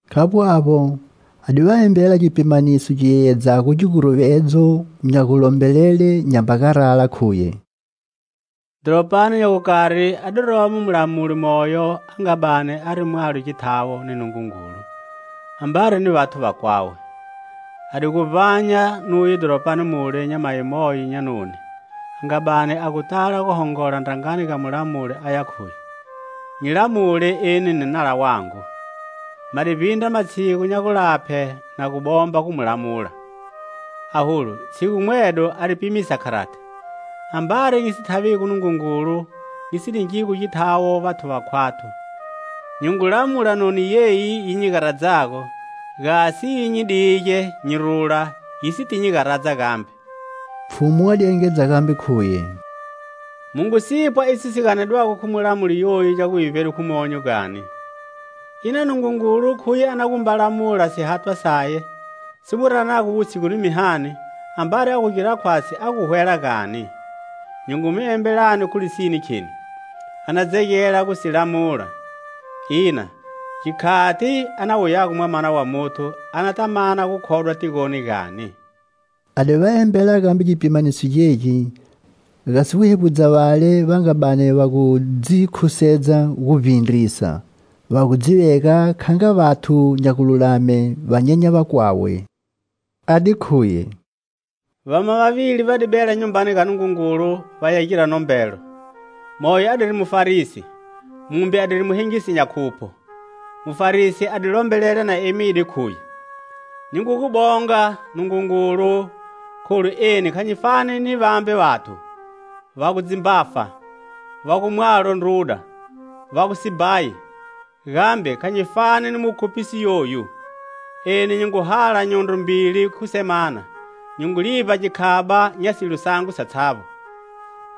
Khavbo avbo, a di va embela gipimaniso gi yeyedzago giguruvedzo nya gulombelele nyamba garala, khuye: "Dhoropani nya gukari a di romo mulamuli moyo a nga bani ari mwalo githawo ni Nungungulu ambari ni vathu vakwawe. A di gu vbanya nuye dhoropani mule nyamayi moyo nya noni a nga bani a gu tala gu hongola ndrangani ga mulamuli, aya khuye: 'Nyi lamule eni ni nala wangu.' Ma di vbindra matshigu nya gulaphe na gu bomba gu mu lamula; aholu tshigu mwedo a di pimisa kharati: 'Ambari nyi si thavigo Nungungulu nyi si ningigo githawo vathu vakhwathu, nyi ngu lamula noni yeyi, yi nyi garadzago, gasi yi nyi dige nyi rula, yi siti nyi garadza gambe.' " Pfhumu a di engedza gambe, khuye: "Mu ngu si pwa iso si ganedwago khu mulamuli yoyu nya guvivbedwe khu monyo gani? Ina Nungungulu khuye a na gu mba lamula sihathwa saye, si mu ranago wutshigu ni mihani, ambari a gu gira khwatshi a gu hwela, gani? Nyi ngu mi embelani, khu lisine, kheni: a na dzegela gu si lamula. Ina gikhati a na wuyago Mwamana wa Muthu, anata mana gukhodwa tigoni, gani?" A di va embela gambe gipimaniso gegi, gasi gu hevbudza vale va nga bani va gu dzikhusedza gu vbindrisa, va gu dzi vega kha nga vathu nya gululame, va nyenya vakwawe, a di khuye: "Vama vavili va di bela Nyumbani ga Nungungulu vaya gira nombelo. Moyo adiri Mufarisi, mumbe adiri muhengisi nya khupho. Mufarisi a di lombelela na emide, khuye: 'Nyi ngu gu bonga, Nungungulu, kholu eni kha nyi fani ni vambe vathu, va gu dzimbafa, va gu mwalo ndruda, va gu sibhayi; gambe kha nyi fani ni mukhuphisi yoyu. Eni nyi ngu hala nyondro mbili khu semana, nyi ngu livba gikhaba nya silo sangu satshavbo.'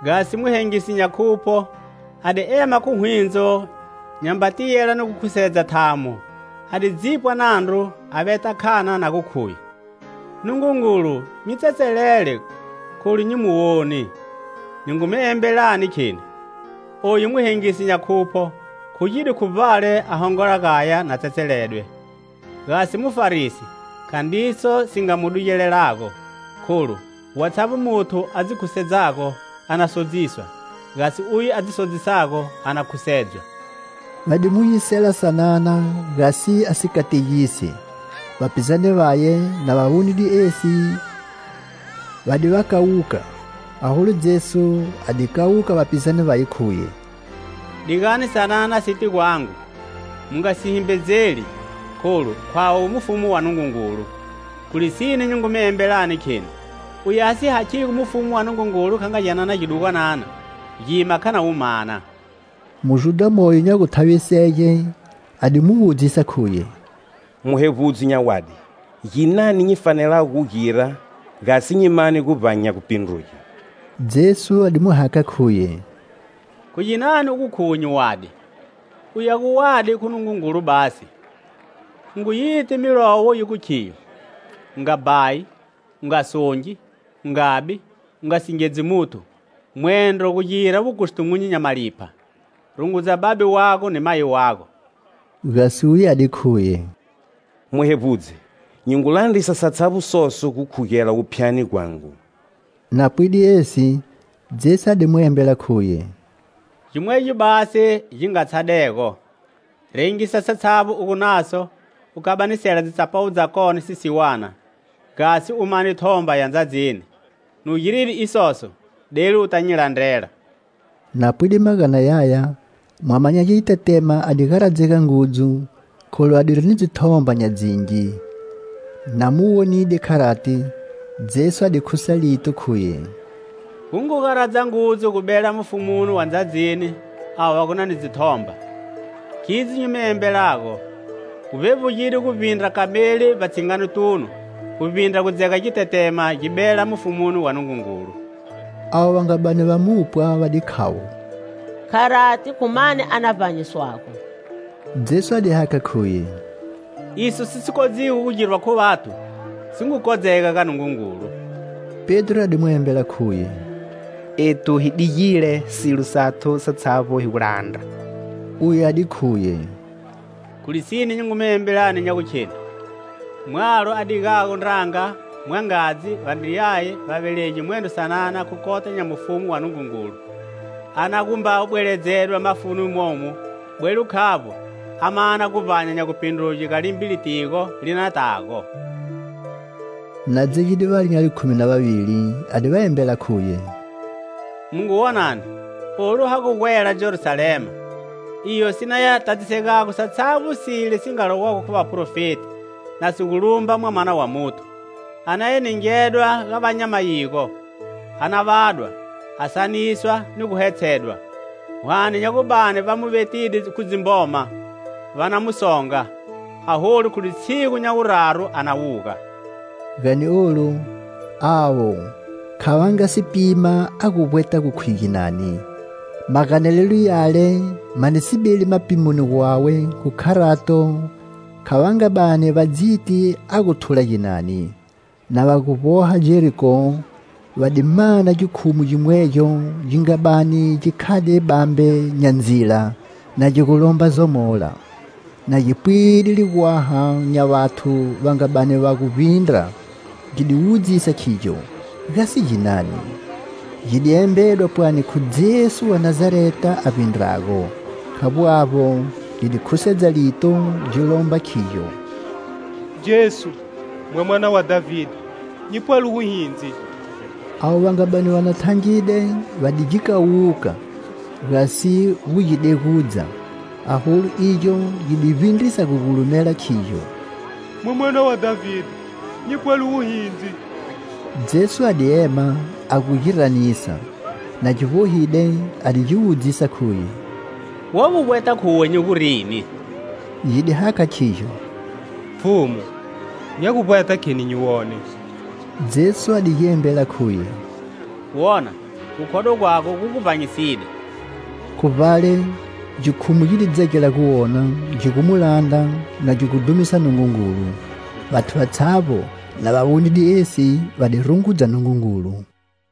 Gasi muhengisi nya khupho, a di ema khu hwindzo, nyamba tiyela ni gu khusedza thamo, a di dzipwa nandru, a veta khana na gu, khuye: 'Nungungulu, nyi tsetselele, kholu nyi muwoni.' Nyi ngu mi embelani, kheni: oyu muhengisi nya khupho khugide khu vbale a hongola gaya na tsetseledwe, gasi mufarisi khandriso si nga mu dugelago. Kholu watshavbo muthu a dzi khusedzago a na sodziswa; gasi uye a dzi sodzisago a na khusedzwa." Va di mu yisela sanana gasi a si kategise. Vapizane vaye, na va wonide esi, va di va kawuka. Aholu Jesu a di kawuka vapizane vaye, khuye: "Digani sanana site gwangu, mu nga si himbedzeli, kholu khwawe mufumu wa Nungungulu. Khu lisine nyi ngu mi embelani, kheni: uye a si hakhigo mufumu wa Nungungulu kha nga gyanana gidugwanana, gima kha na wu mana." Mujudha moyo nya guthavisege a di mu wudzisa, khuye: "Muhevbudzi nya wadi, ginani nyi fanelago gu gira, gasi nyi mane guvbanya nya gupindruge?" Jesu a di mu hakha, khuye: "Khu ginani u gu khuwe nyi wadi? Uye a gu wadi khu Nungungulu basi. U ngu yi ti milayo yi gu khiyo: 'U nga bhayi, u nga songi, u nga bi, u nga singedzi muthu, mwendro gu gira wukustumunyu nya malipha; rungudza babe wago ni mayi wago.' " Gasi uye a di khuye: "Muhevbudzi, nyi ngu landrisa satshavbo soso gukhugela wuphyani gwangu." Na pwide esi, Jesu a di mu embela, khuye: "Gimwegyo basi gi nga tshadego. Rengisa satshavbo u gu naso, u kabanisela dzitsapawu dzakone sisiwana, gasi u mane thomba ya ndzadzini. Nu giride isoso, delu uta nyi landrela." Na pwide magana yaya, mwama nya gitetema a di garadzega ngudzu, kholu adiri ni dzithomba nya dzingi. Na mu wonide kharati, Jesu a di khusa lito, khuye: "Gu ngu garadza ngudzu gu bela mufumuni wa ndzadzini avo va gu ni dzithomba! Khidzo nyi mi embelago, gu vbevbugide guvbindra kameli vbatshinganotunu, guvbindra gu dzega gitetema gi bela mufumuni wa Nungungulu!" Avo va nga bani va mu pwa va di khavo: "Kharati khu mani a na vbanyiswago?" Jesu a di hakha, khuye: "Iso si si kodzigo gu girwa khu vathu, si ngu kodzega ga Nungungulu." Pedro a di mu embela, khuye: "Ethu hi digile silo sathu satshavbo hi gu landra." Uye a di khuye: "Khu lisine nyi ngu mi embelani nya gu kheni: mwalo a digago ndranga, mwangadzi, vandriyaye, vavelegi mwendro sanana khu kota nya mufumu wa Nungungulu, a na gu mba bweledzedwa mafuni momu, bwelo khavbo a mana guvbanya nya gupindruge ga limbe litigo li na tago." Na dzegide vale nya likhumi na vavili, a di va embela, khuye: "Mu ngu, wonani, olu ha gu gwela Jerusalema, iyo si naya tadzisegago satshavbo sile si nga lowago khu vaprofeti na si gu lumba Mwamana wa Muthu. A na ya ningedwa ga va nya mayigo. A na vadwa, a saniswa ni gu hetshedwa. Hwane nya gu bani va mu vetide khu dzimboma, va na mu songa. Aholu khu litshigu nya wuraru a na wuga." Gani olu, avo kha va nga si pima a gu vbweta gu khuye ginani. Maganelelo yale ma di si beli mapimoni gwawe, khu kharato, kha va nga bani va dziti a gu thula ginani. Na va gu vboha Jeriko, va di mana gikhumu gimwegyo gi nga bani gi khade bambe nya ndzila, na gi gu lomba zomola. Na gi pwide ligwaha nya vathu va nga bani va gu vbindra, gi di wudzisa khigyo: gasi ginani. Gi di embedwa pwani khu Jesu wa Nazareta a vbindrago. Khavbo avbo, gi di khusedza lito, gi lomba, khigyo: "Jesu, Mwamana wa Dhavide, nyi pwele wuhindzi!" Avo va nga bani va thangide va di gi kawuka, gasi gu gi degudza. Aholu igyo gi di vbindrisa gu gulumela, khigyo: "Mwamana wa Dhavide, nyi pwele wuhindzi!" Jesu a di ema, a gu gi ranisa. Na gi vbohide, a di gi wudzisa, khuye: "Wa gu vbweta khuwe nyi gu rini?" Gi di hakha, khigyo: "Pfhumu, nya gu vbweta kheni nyi wone!" Jesu a di gi embela, khuye: "Wona. Gukhodwa gwago gu gu vbanyiside." Khu vbale, gikhumu gi di dzegela gu wona, gi gu mu landra, na gi gu dhumisa Nungungulu. Vathu vatshavbo, na va wonide esi, va di rungudza Nungungulu.